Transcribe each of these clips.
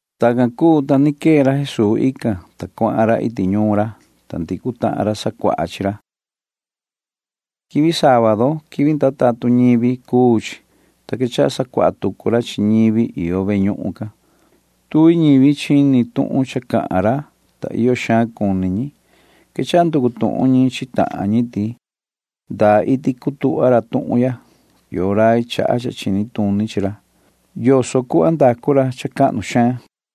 Tacan cuu, ta ni quee ra Jesuu ican, ta cuahan ra iti ñuun ra, ta ndicu tahan ñivi sacuaha chi ra. Quivi sábadu [quivi ndaa tatun ñivi] cuu chi, ta quechaha sacuaha tucu ra chi ñivi iyo ve ñuhun can. Tuvi ñivi chini tuhun cha cahan ra, ta iyo xaan cuni ñi. Quechaha nducu tuhun ñi chi tahan ñi ti: ―¿Ndaa iti cutuhva ra tuhun ya? ¿Yoo rai chaha cha chini tuni chi ra? ¿Yoso cuu savaha ra cuhva cahnu xaan can?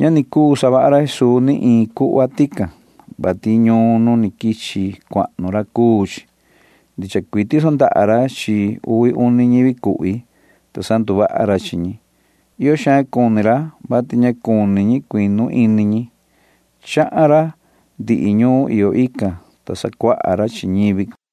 Ña ni cuu savaha ra Jesuu ni iin cuhva tican, [vati ñuun nu ni quichi cuahnu ra cuu chi]. Tiso ni ra ndaha ra chi iin uvi ñivi cuhvi, ta sanduvaha ra chi ñi. Iyo xaan cuni ra, vati ña cuni ñi cuinu ini ñi. Chahan ra ndihi ñuun iyo ican, ta sacuaha ra chi ñivi can.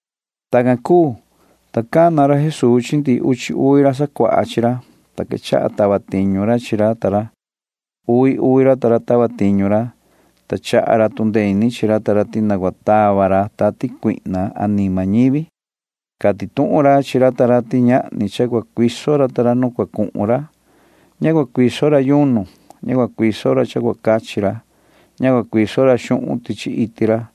Tacan cuu, ta cana ra Jesuu chi ndihi uchi uvi ra sacuaha chi ra, ta quechaha tava tiñu ra chi ra ta ra. Uvi uvi ra ta ra tava tiñu ra, ta chaha ra tu ndee ini chi ra ta ra ti na cua tava ra tati cuihna anima ñivi. Cati tuhun ra chi ra ta ra ti ñahni cha cua cuiso ra ta ra nu cua cuhun ra. Ña cua cuiso ra yunu. Ña cua cuiso ra cha cua cachi ra. Ña cua cuiso ra xuhun tichi iti ra.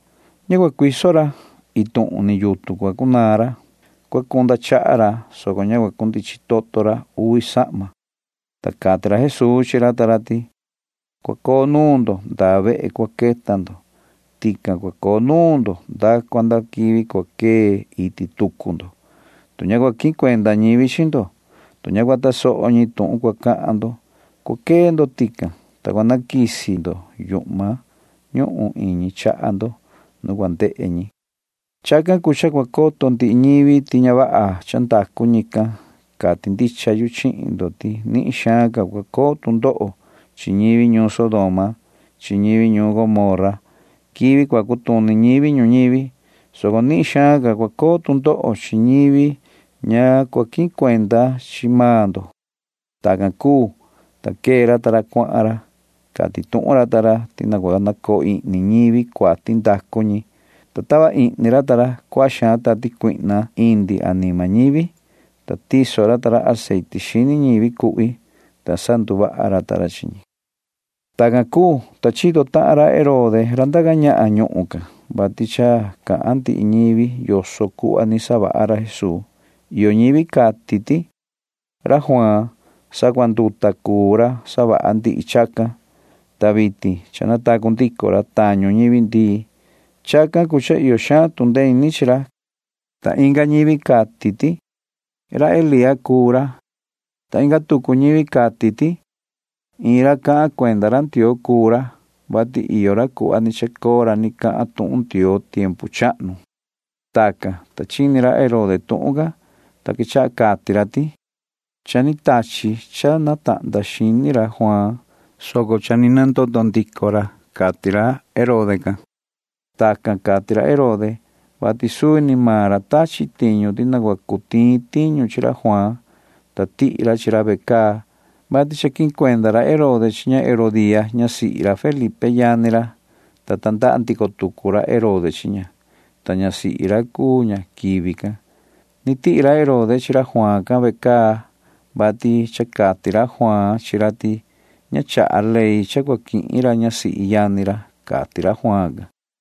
Ña cua cuiso ra. Iin tuhun ni yutun cua cunaan ra. Cua cunda chaha ra, soco ña cua cundichin toto ra uvi sahma, ta cati ra Jesuu chi ra ta ra ti: ―Cua coo nuun ndo ndaa vehe cua quihvi ndo. Tican cua coo nuun ndo nda cua nda quivi cua quee iti tucu ndo. Tu ña cua quihin cuenda ñivi chi ndo, tu ña cua tasoho ñi tuhun cua cahan ndo, cua quee ndo tican, ta cua naquisi ihni ndo yuhma iñi chaha ndo nu cua ndehe ñi. Chacan cuu cha cua coto ndihi ñivi ti ña vaha cha ndacu ñican. Cati ndicha yu chihin ndo ti nihin xaan cua coo tu ndoho chi ñivi ñuun Sodoma chi ñivi ñuun Gomorra quivi cua cutuni ñivi ñuñivi, soco nihin xaan ca cua coo tu ndoho chi ñivi ña cua quihin cuenda chi maan ndo ―cati ra Jesuu. Tacan cuu, ta quee ra ta ra, ta cuahan ra. Cati tuhun ra ta ra ti na cua nacoo ihni ñivi cuati ndacu ñi, ta tava ihni ra ta ra cuaha xaan tati cuihna indi anima ñivi. Choso tahan ra ta ra aceite chi ñivi cuhvi, ta sanduvaha ra ta ra chi ñi. Tacan cuu, ta chito tahan ra Herode ra ndaca ñahan ñuhun can, vati cha cahan ndihi ñivi yoso cuhva ni savaha ra Jesuu. Iyo ñivi cati ti: ―Juaan ra sacuanduta cuu ra savaha ndihi chacan, ta vitin cha natacu ndico ra tañu ñivi ndii. Chacan cuu cha iyo xaan tu ndee ini chi ra ―cati ñi. Ta inga ñivi cati ti: ―Elía cuu ra ―cati ñi. Ta inga tucu ñivi cati ti: ―Iin ra cahan cuenda ra Ndioo cuu ra, vati iyo ra cuhva ni chacoo ra ni cahan tuhun Ndioo tiempu chahnu ―cati ñi. Tacan, ta chini ra Herode tuhun can, ta quechaha cati ra ti: ―Cha ni quende xini ra Juaan, soco cha ni nandoto ndico ra ―cati ra Herode can. Tacan cati ra Herode, vati suvi ni maan ra tachi tiñu ti na cua cu tiin tiñu chi ra Juaan, ta tihi ra chi ra ve caa, vati cha quihin cuenda ra Herode chi ña Herodía ñasihi ra Felipe yani ra, ta tandaha ndico tucu ra Herode chi ña, ta ñasihi ra cuu ña quivi can. Ni tihi ra Herode chi ra Juaan can ve caa, vati cha cati ra Juaan chi ra ti ña chaha ley cha cua quihin ra ñasihi yani ra, cati ra Juaan can.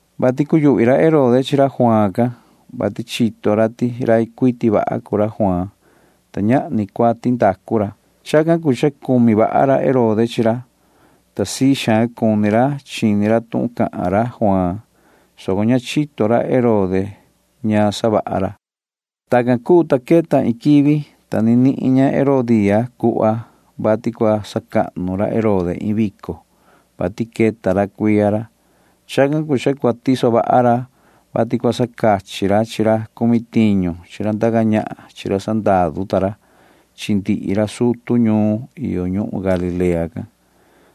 vati cuyuhvi ra Herode chi ra Juaan can, vati chito ra ti rai cuiti vaha cuu ra Juaan, ta ñahni cuati ndacu ra. Chacan cuu cha cumi vaha ra Herode chi ra, ta sii xaan cuni ra chini ra tuhun cahan ra Juaan, soco ña nihin ra Herode cuhva yoso cua saxini ra. Tacan cuu, ta queta iin quivi, ta ni nihin ña Herodía cuhva, vati cua sacahnu ra Herode iin vico, vati cha queta cuiya ra. Chacan cuu cha cua tiso vaha ra, vati cua sacachi ra chi ra cumi tiñu chi ra ndaca ñahan chi ra sandaru ta ra chi ndihi ra sutu ñuun iyo ñuhun Galilea can.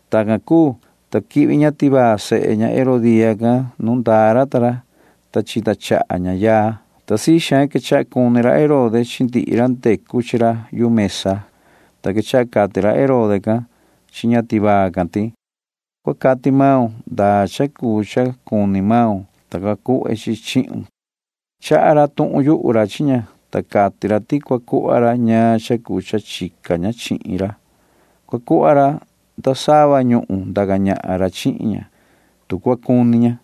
Tacan cuu, ta quihvi ña tivaa sehe ña Herodía can nu ndaa ra ta ra, ta chita chaha ña yaa, ta sii xaan quechaha cuni ra Herode chi ndihi ra ndecu chi ra yu mesa can, ta quechaha cati ra Herode can chi ña tivaa can ti: ―Cua cati maun ndaa cha cuu cha cuni maun, ta cua cuhve chi chi chihun ―cati ra. Cahan rai ra chi ña, ta cati ra ti cua cuhva ra ñaan cha cuu cha chica ña chihin ra. Cua cuhva ra nda sava ñuhun ndaca ñahan ra chihin ña, tu cua cuni ña.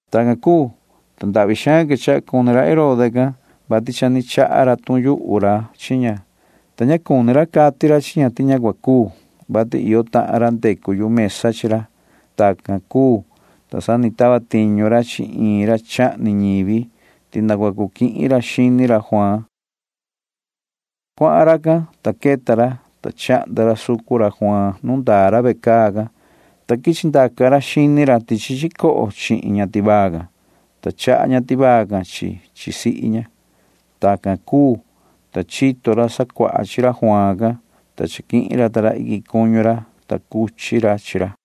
Tacan cuu, ta ndahvi xaan quechaha cuni ra Herode can, vati cha ni cahan rai ra chi ña, ta ña cuni ra cati ra chi ña ti ña cua cuu, vati iyo tahan ra ndecu yu mesa chi ra. Tacan cuu, ta sa ni tava tiñu ra chi iin ra chahni ñivi ti na cua cu quihin ra xini ra Juaan. Cuahan racan, ta queta ra, ta chahnda ra sucun ra Juaan nu ndaa ra ve caa can, ta quichi ndaca ra xini ra tichi chicoho can, ta chandaca ra chi chi chi ña tivaa can, ta chaha ña tivaa can chi chi chi sihi ña. Tacan cuu, ta chito ra sacuaha chi ra Juaan can, ta chaquihin ra iquin cuñu ra, ta cuchi ra chi ra.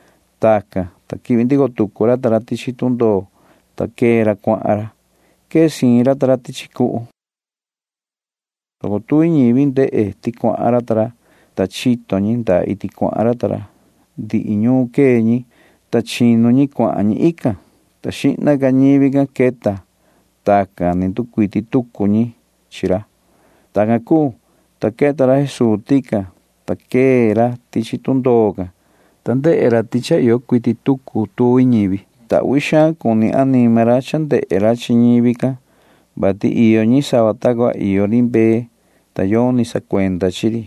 Tacan, ta quihvi ndico tucu ra ta ra tichi tundoo, ta quee ra cuahan ra. Quee siin ra ta ra tichi cuhu, soco tuvi ñivi ndehe ti cha cuahan ra ta ra, ta chito ñi ndaa iti cuahan ra ta ra. Quee ñi ndihi ñuun can, ta chinu ñi cuahan ñi ican, ta queta xihna maan ñivi can. Tacan ni nducuiti tucu ñi. Tacan cuu, ta queta ra Jesuu tican, ta quee ra tichi tundoo can, ta ndehe ra ti cha iyo cuiti tucu tuvi ñivi, ta uhvi xaan cuni anima ra cha ndehe ra chi ñivi can, vati iyo ñi sava ta cua iyo ri mbee, ta yoni sacuenda chi ri.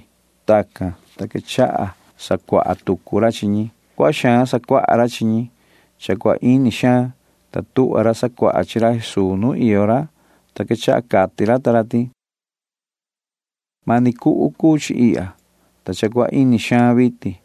Tacan, ta quechaha sacuaha tucu ra chi ñi. Cuaha xaan sacuaha ra chi ñi. Cha cua ini xaan, ta tuhva ra sacuaha chi ra Jesuu nu iyo ra, ta quechaha cati ra ta ra ti: ―Mani cuhu cuu chi ihya, ta cha cua ini xaan vitin.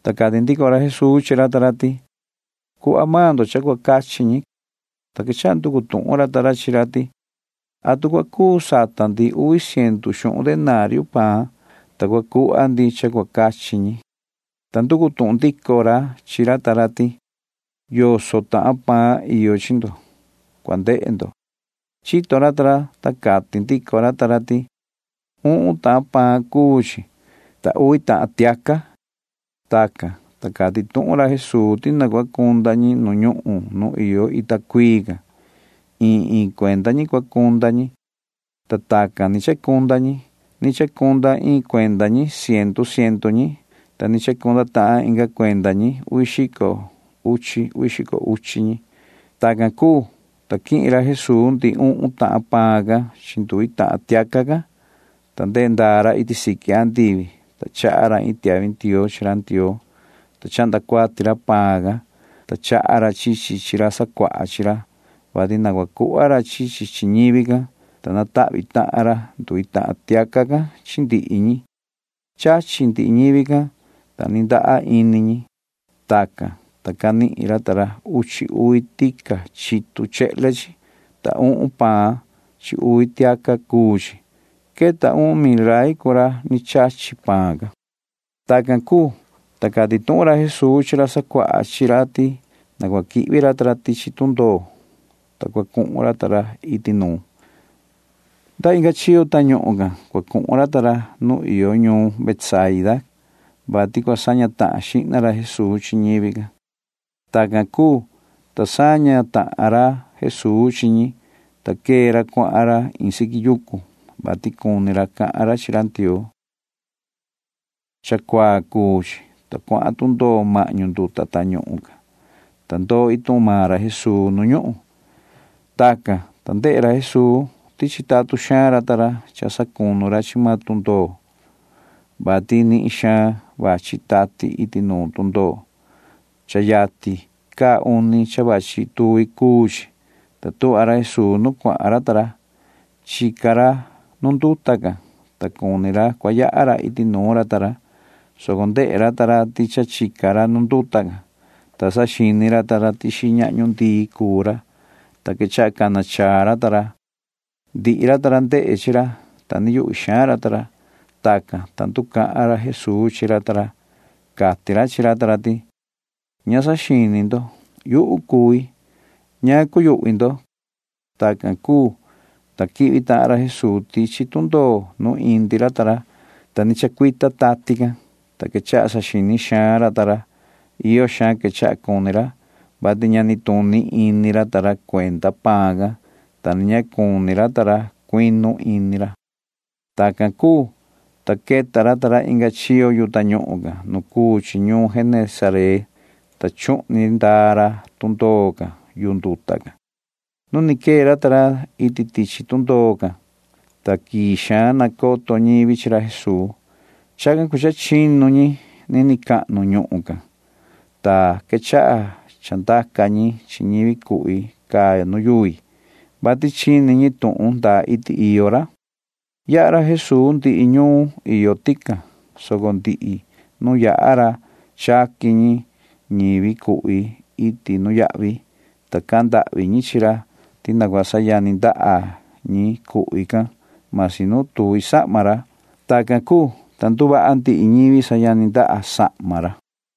Ta cati ndico ra Jesuu chi ra ta ra ti: ―Cuhva maan ndo cha cua cachi ñi ―cati ra. Ta quechaha nducu tuhun ra ta ra chi ra ti: ―¿Atu cua cu sata ndi uvi ciendu xuhun denario paan, ta cua cuhva ndi cha cua cachi ñi? ―cati ra ta ra. Ta nducu tuhun ndico maan ra chi ra ta ra ti: ―¿Yoso tahan paan iyo chi ndo? Cua cu ndehe ndo ―cati ra. Cha chito ra ta ra, ta cati ndico ra ta ra ti: ―Uhun tahan paan cuu chi, ta uvi tahan tiaca ―cati ra ta ra. Tacan, ta cati tuhun ra Jesuu ti na cua cunda ñi nu ñuhun nu iyo ita cuii can. Iin iin cuenda ñi cua cunda ñi, ta tacan ni chacunda ñi. Ni chacunda iin cuenda ñi ciendu ciendu ñi, ta ni chacunda tahan inga cuenda ñi uvi xico uchi uvi xico uchi ñi. Tacan cuu, ta quihin ra Jesuu ndihi uhun tahan paan can chi nduvi tahan tiaca can, ta ndehe ndaa ra iti siqui andivi, ta chaha ra iin tiahvi ndioo chi ra Ndioo, ta chahnda cuati ra paan can, ta chaha ra chi chi chi ra sacuaha chi ra, vati na cua cuhva ra chi chi chi ñivi can, ta natahvi tahan ra nduvi tahan tiaca can chi ndihi ñi. Chachi ndihi ñivi can, ta ni ndaha ini ñi. Tacan, ta canihin ra ta ra uchi uvi tica chitu chehle can, ta uhun paan chi uvi tiaca cuu chi. Queta uhun mil rai cuu ra ni chachi paan can. Tacan cuu, ta cati tuhun ra Jesuu chi ra sacuaha chi ra ti na cua quihvi ra ta ra tichi tundoo, ta cua cuhun ra ta ra iti nuun. Nda inga chiyo tañuhun can cua cuhun ra ta ra nuun iyo ñuun Betsaida can, vati cua saña tahan xihna ra Jesuu chi ñivi can. Tacan cuu, ta saña tahan ra Jesuu chi ñi, ta quee ra cuahan ra iin siqui yucu, vati cuni ra cahan ra chi ra Ndioo. Cha cuaa cuu chi, ta cuahan tundoo mahñu nduta tañuhun can, ta ndoo maan iin tuhun ra Jesuu nu ñuhun. Tacan, ta ndehe ra Jesuu ti chitatun xaan ra ta ra cha sacunu ra chi maan tundoo, vati nihin xaan vachi tati iti nuun tundoo. Cha yatin caa uni cha vachi tuvi cuu chi, ta tuhva ra Jesuu nu cuahan ra ta ra. Chica ra nu nduta can, ta cuni ra cua yaha ra iti nuun ra ta ra, soco ndehe ra ta ra ti cha chica ra nu nduta can, ta saxini ra ta ra ti xiñahñu ndii cuu ra, ta quechaha cana chaa ra ta ra. Ndihi ra cuu ra ndehe chi ra, ta yuhvi xaan ra ta ra. Tacan, ta nducahan ra Jesuu chi ra ta ra. Cati ra chi ra ta ra ti: ―Cua cundee ini ndo. Yuhu cui. Ña cua cuyuhvi ndo ―cati ra. Tacan cuu, ta quihvi tahan ra Jesuu tichi tundoo nu indi ra ta ra, ta ni chacuita tati can, ta quechaha saxini xaan ra ta ra. Iyo xaan quechaha cuni ra, vati ña nituni ini ra ta ra cuenda paan can, ta ni ña cuni ra ta ra cuinu ini ra. Tacan cuu, ta queta ra ta ra inga chiyo yu tañuhun can nu cuu chi ñuun Genesaret, ta chuhni ndaa ra tundoo can yu nduta can. Nu ni quee ra ta ra iti tichi tundoo, ta quii xaan nacoto ñivi chi ra Jesuu. Chacan cuu cha chinu ñi nini cahnu ñuhun can, ta quechaha chandaca ñi chi ñivi cuhvi caa nu yuvi, vati chini ñi tuhun ndaa iti iyo ra. Yaha ra Jesuu ndihi ñuun iyo tican, soco ndihi nu yaha ra chaqui ñi chi ñivi cuhvi iti nuyahvi, ta cahan ndahvi ñi chi ra ti na cua sayani ndaha ñi cuhvi can―masi nu tuvi sahma ra. Tacan cuu, ta nduvaha ndihi ñivi sayani ndaha sahma ra.